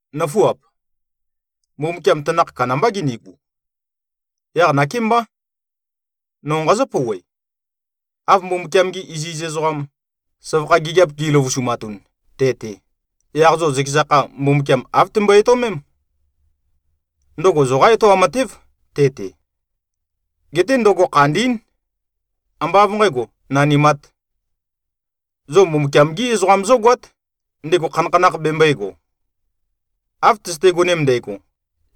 Nǿfuap! Mbumbukiam tanakh kandambá ginigu. Yaq nakémbá. No nqazǿ-pouwe. Av Mbumbukiam-gi iziz ezoqam, søvakha gigiap gi꞉løvusumatun te-te, yaq zo zøkeza kha Mbumbukiam āv tømbøe-etøomém. Ndøgo zoqá etoam matév, te-te. Geté ndøgo khandín. Ambá av nqægo, nanimāt. Zo Mbumbukiam-gí ezoqam zógoát, ndego khanakhanakh bembøēgo. Av tøzøte-gonem ndægo,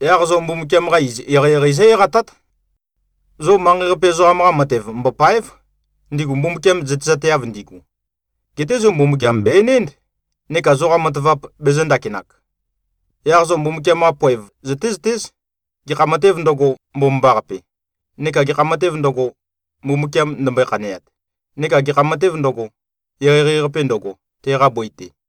yaq zo Mbumbukiam-qa iz eqeieqei zó-eqatát. Zo manqei-qape ezoqam-qa matev mbòpa᷄ev, ndigu Mbumbukiam zøtezateav ndigu. Geté zo Mbumbukiam bè-enénd, neka zoqa matavap bezø̄-ndakinak. Yaq zo Mbumbukiam-qa poev zøtézøtéz, gekha matēv ndøgo, mbomambaqape, neka gekha matēv ndøgo, Mbumbukiam ndømbøe-khaneat, neka gekha matēv ndøgo, eqeieqei-qape ndøgo, teqa bøi-te.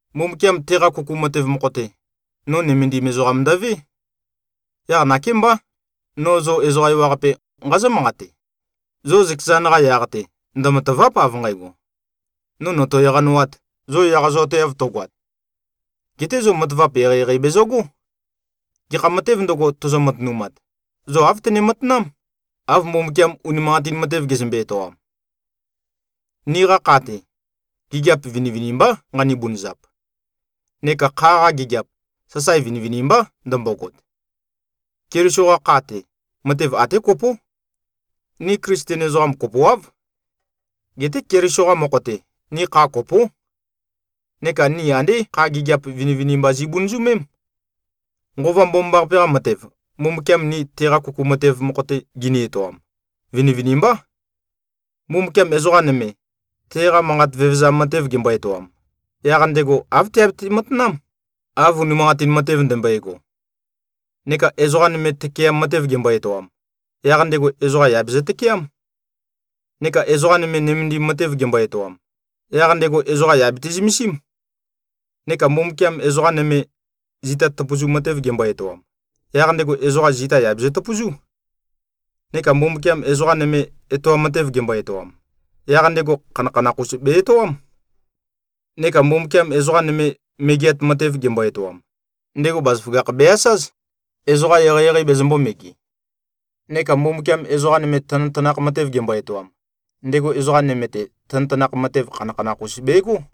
Mbumbukiam teqa kuku matev mokho-te, no nømendim ezoqam ndøvé. Yaq nakémbá, no zo ezoqa ewaqape, nqazǿ-manqate: Zo zøkezan-qa yaq-te ndømatàva᷄p av nqægo, “No nòto-eqanowāt,” zo eqazoateav tøgoat. Geté zo matavap eqeieqei bezøgó. Gekha matēv ndøgo, tozo-matønumat, zo āv tøne-matanám, av Mbumbukiam unimanqatin matev gezømbe-etoam. Niqa kha-te, gigiap vinivinimbá nqani-bunøzap. Neka kha-qa gigiap, sasae vinivinimbá ndømbogot. Keliso-qa kha-te, matev até kopó. Ni Klisten ezoqam kopoáv. Geté Keliso-qa mokho-te, ni kha kopó. Neka ni andé kha gigiap vinivinimba zi꞉bunøzømém. Nqova Mbomambaqape-qa matev, Mbumbukiam ni teqa kuku matev mokho-te gini-etoam, vinivinimbá. Mbumbukiam ezoqa nøme, teqa manqat vevezam matev gembo-etoam, yaq ndego āv teabete-matanám, av unimanqatin matev ndømbøego. Neka ezoqa nøme tøkeam matev gembo-etoam, yaq ndego ezoqa yà bezø-tøkeám. Neka ezoqa nøme, nømendim matev gembo-etoam, yaq ndego ezoqa yà bete-zømesím. Neka Mbumbukiam ezoqa nøme, zita tøpøzu matev gembo-etoam, yaq ndego ezoqa zita yà bezøtøpøzú. Neka Mbumbukiam ezoqa nøme, etoam matev gembo-etoam, yaq ndego khanakhanakh-us be-etoám. Neka Mbumbukiam ezoqa nøme, megeat matev gembo-etoam, ndego bazaføgakh be-asáz, ezoqa eqeieqei bezømbō-mege. Neka Mbumbukiam ezoqa nøme tanøtanakh matev gembo-etoam, ndego ezoqa nøme-te tanøtanakh matev khanakhanakh-us begó.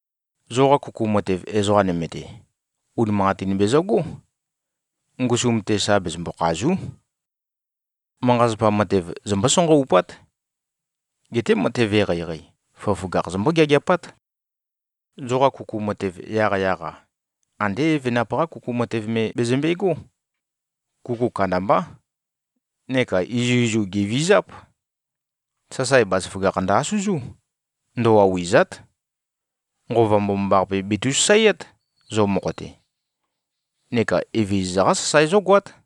Zoqa kuku matev ezoqa nøme-te, unimanqatin bezøgó. Ngusum-te sa bezømbo-khàzu᷄. Manqa-zapa matev zombó-sanqaupát. Geté matev eqeieqei, føgøføgakh zombó-geageapát. Zoqa kuku matev yaqyaq-a, andé evenap-qá kuku matev me bezømbe꞉gó. Kuku kandambá. Neka izuizu gèvizáp. Sasae bazaføgakh ndø-asøzú. Ndøwauwì꞉za᷄t. Nqova Mbomambaqape betu꞉-sasaeát, zo mokho-te, neka Evezøza-qá sasae zógoát.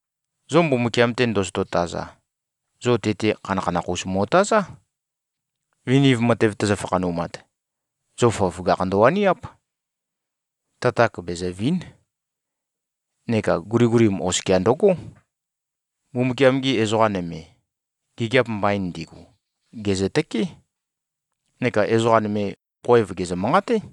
Zo Mbumbukiam-te ndozoto-taza, zo te-te khanakhanakh-us mo꞉tazá. Viniv matev tøzø-fakhanumat, zo føgøføgakh ndøwaniáp. Tatak bezø̀vi᷄n. Neka guligulim oskia ndøgó. Mbumbukiam-gi ezoqa nøme, gigiap mbain ndigu, gèzøtøkeé, neka ezoqa nøme khoev gèzø-manqaté.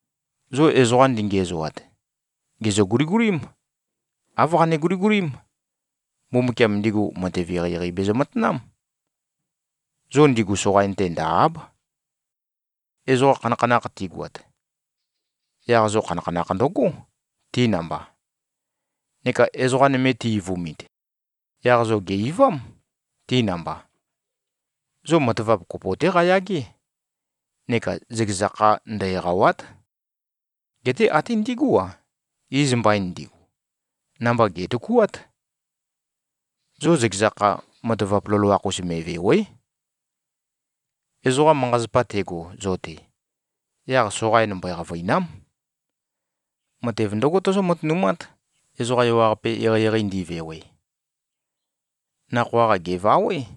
Zo ezoqa ndingiæzoat, gèzø-guligulím. Āv qane-guligulím: Mbumbukiam, ndigu matev eqeieqei bezø-matanám. Zo ndigu soqain-te ndø̀-a᷄b. Ezoqa khanakhanakh tigoat, yaq zo khanakhanakh ndøgó, ti namba. Neka ezoqa nøme ti-eivumit, yaq zo gè-eivám, ti namba. Zo matavap kopo-té qayagé. Neka zøkeza kha ndø-eqàwa᷄t. Geté até ndigú-a, iz mbain ndigu, namba gè꞉tøkuát. Zo zøkeza kha matavap loloakh-us me꞉vèwe᷄. Ezoqa manqa-zapa tego zo-te, yaq soqain mbøe-qavø̀ina᷄m. Matev ndǿgo tozó-matønumát, ezoqa ewaqape eqeieqei ndivewe. Nakhoa-qa gèvawé,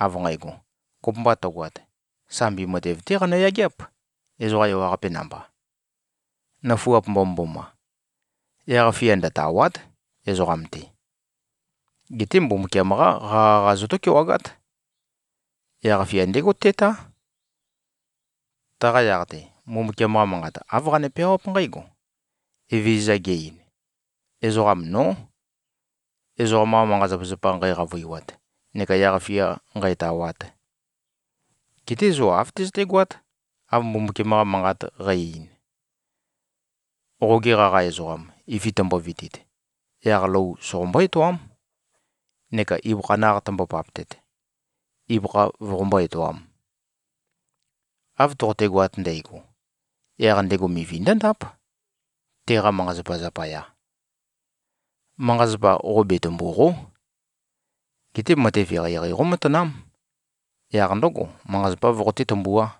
av nqægo: Kopømba tøgoat, sambi matev-té qanø-yageáp, ezoqa ewaqape namba. Nøfuap mbomømboma! Yaq-fia ndøtàwa᷄t, ezoqam-te. Geté Mbumbukiam-qá qaqa-qa zotó-kewagát. Yaq-fia ndégo tétá. Taqa yaq-te, Mbumbukiam-qa Manqat āv qane-peawáp nqǽgo: Evezøza ge-ein, “Ezoqam nó, ezoqam-qa manqa-zapazapa nqæqavøiwat neka yaq-fia nqǣtāwāt.” Geté zo āv tøzøtégoát, av Mbumbukiam-qa Manqat qæ-ein, “Qoge qaqa ezoqam, ifi tømbovitit, yaq lou soqombó-etoám, neka ibøkha naq tømbo-paptet, ibøkha voqombó-etoām. Av toqotegoat ndægo, yaq ndego mivi ndǿndáp, teqa manqa-zapa zapaya.” Manqa-zapa qo betømbùqo᷄. Geté matev eqeieqei qómatanám. Yaq ndǿgo, manqa-zapá voqoté-tømbuá.